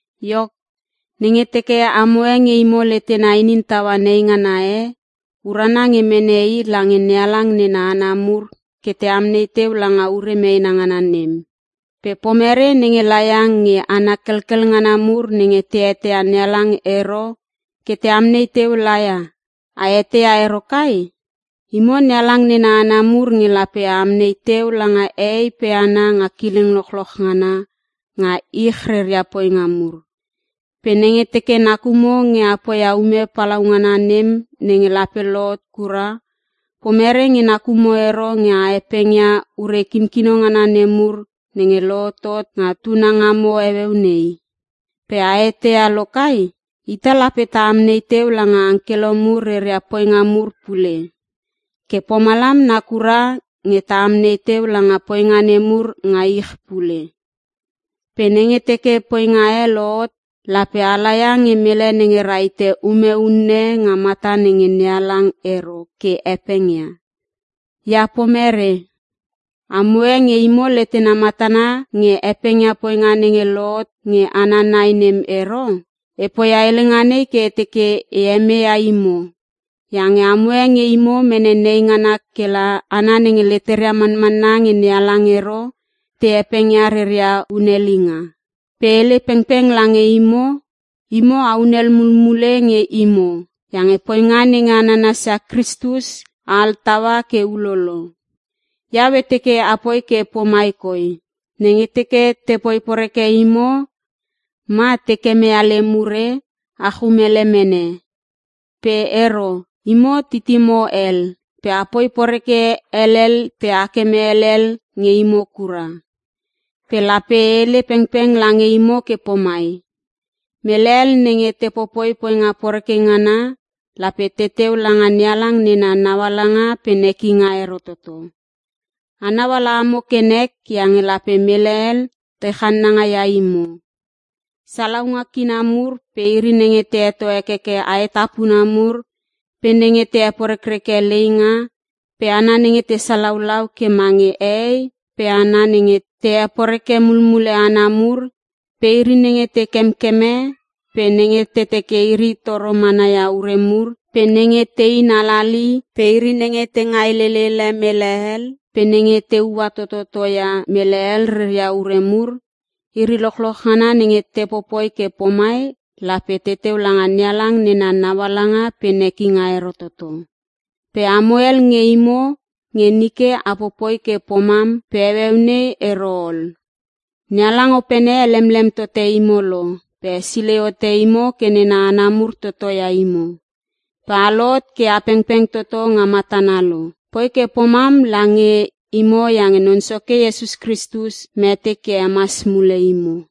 Iok, nenge teke amoe nge imo letena inin taua neingana e, urana nge mene i lange NeHalang nena hana mur ke te amnei teu langa ure meena ngana nem. Pe pomerei nenge laia nge hana kelkel ngana mur nenge te eteia NeHalang ero ke te amnei teu la ia? A eteia ero kai? Imo NeHalang nena hana mur nge lape a amnei teu langa hehei pe hana nga kileng lochloch ngana nga ich reria poinga mur. Pe nenge teke nakumo nge a poia ume palaungana nem nenge lape lohot kura, pomere nge nakumo ero nge a hepengia ure kinkino ngana nemur nenge lohotot nga tunangamo heueu nei? Pe a eteia lokai? Ita lape ta amnei teu langa angkelo mur reria poinga mur pule. Ke pomalam nakura nge ta amnei teu langa poinga nemur nga ich pule. Pe nenge teke poinga e lohot, lape a laia nge mele nenge rahite ume unne nga mata nenge NeHalang ero ke hepengia? Ia pomerei, amoe nge imo letena matana nge hepengia poinga nenge lohot nge hana nai nem ero? E poia helenga nei ke e teke e hemeia imo, iange amo e nge imo mene neingana kela hana nenge leteria manmanna nge NeHalang ero te hepengia reria hunhelinga. Pe e hele pengpeng lange imo; Imo a hunel mulmule nge imo iange poinga nenge a nanasia Kristus a altaua ke ulolo. Iau e teke apoi ke pomai koi: Nenge teke te poi poreke imo ma te kemeia lem ure, a chumele mene. Pe ero. Imo titimo hel. Pe apoi poreke helel pe a keme helel nge imo kura. Pe lape e hele pengpeng lange imo ke pomai; Mele hel nenge te popoi poinga poreke ngana lape teteu langa NeHalang nena naualanga pe nekinga ero toto. Anau ala amo ke nek iange lape mele hel te channanga ia imo. Salaunga kina mur pe iri nenge te heto hekeke aetapuna mur pe nenge te heporekreke leinga pe hana nenge te salaulau ke mange hehei pe hana nenge te heporeke mulmule hana mur, pe iri nenge te kemkeme pe nenge te teke iri toro manaia ure mur, pe nenge tein halali pe iri nenge te ngailelele mele hel pe nenge te ua tototo ia mele hel reria ure mur; iri lochloch ngana nenge te popoi ke pomai lape teteu langa NeHalang nena naualanga pe nekinga ero toto. Pe amo hel nge imo, nge nike a popoi ke pomam pe heueu nei ero ol. NeHalang Opene helemlem tote imo lo pe hesilei hote imo ke nena hana mur toto ia imo. Pe a lohot ke a pengpeng toto nga matana lo. Poi ke pomam lange imo iange Non Soke Iesus Kristus mete ke hemas mule imo.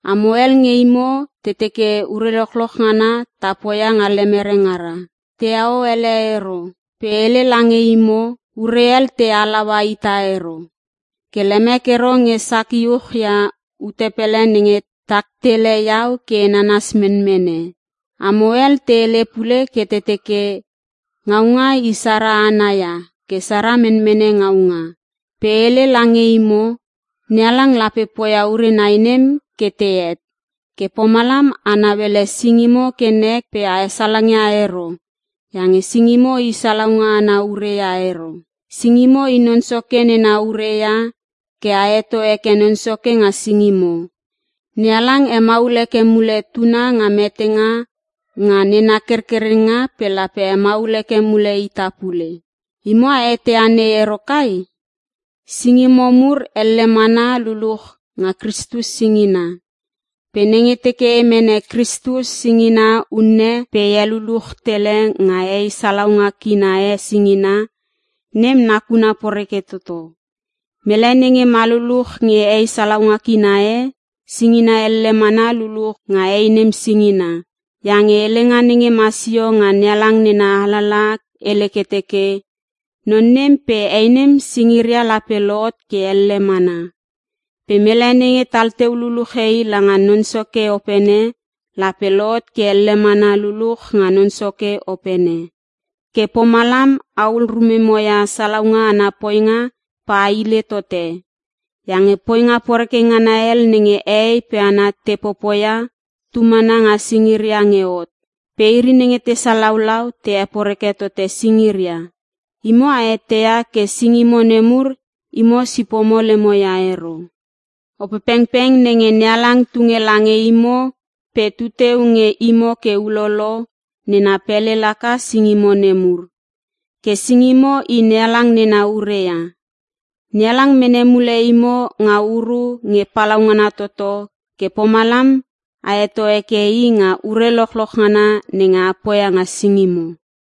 Amo hel nge imo te teke, “Ure lochloch ngana, ta poia nga lemere ngara. Teheo ele ero.” Pe e hele lange imo, ure hel te halaua ita ero. Ke lemek ero nge sak iuch ia ute pele nenge tak tele iau ke e nanas menmene. Amo hel te hele pule ke te teke, “Ngaunga i sara ana ia ke sara menmene ngaunga.” Pe e hele lange imo, NeHalang lape poia ure nai nem ke tehet. Ke pomalam a nauele singimo ke nek pe a hesalangia ero iange singimo i salaunga ana ure ia ero. Singimo i Non Soke nena ure ia ke a heto heke Non Soke nga singimo. NeHalang hemaul heke mule Tuna nga metenga nga nena kerkerenga pe lape hemaul heke mule ita pule. Imo a eteia nei ero kai? Singimo mur elle mana luluch nga Kristus singina. Pe nenge teke e mene Kristus singina unne pe e heluluch tele nga hei salaunga kina e singina, nem nakuna poreke toto. Mele nenge ma luluch nge hei salaunga kina e singina elle mana luluch nga hei nem singina. Iange helenga nenge ma sio nga NeHalang nena alalaha hele ke teke, “Non nem pe hei nem singiria lape lohot ke elle mana.” Pe mele nenge tal teu luluche i langa Non Soke Opene, lape lohot ke elle mana luluch nga Non Soke Opene. Ke pomalam ahul rumemo ia salaunga ana poinga pe a hile tote. Iange poinga poreke ngana hel nenge hehei pe hana te popoia tu mana nga singiria nge hot. Pe iri nenge te salaulau te heporeke tote singiria. Imo a eteia ke singimo nemur imo sipomo lemo ia ero. Opepengpeng nenge NeHalang tunge lange imo pe tuteu nge imo ke ulolo, nena pele laka singimo nemur. Ke singimo i NeHalang nena ure ia. NeHalang mene mule imo nga uru nge palaungana toto ke pomalam a heto heke I nga ure lochloch ngana nenge a poia nga singimo.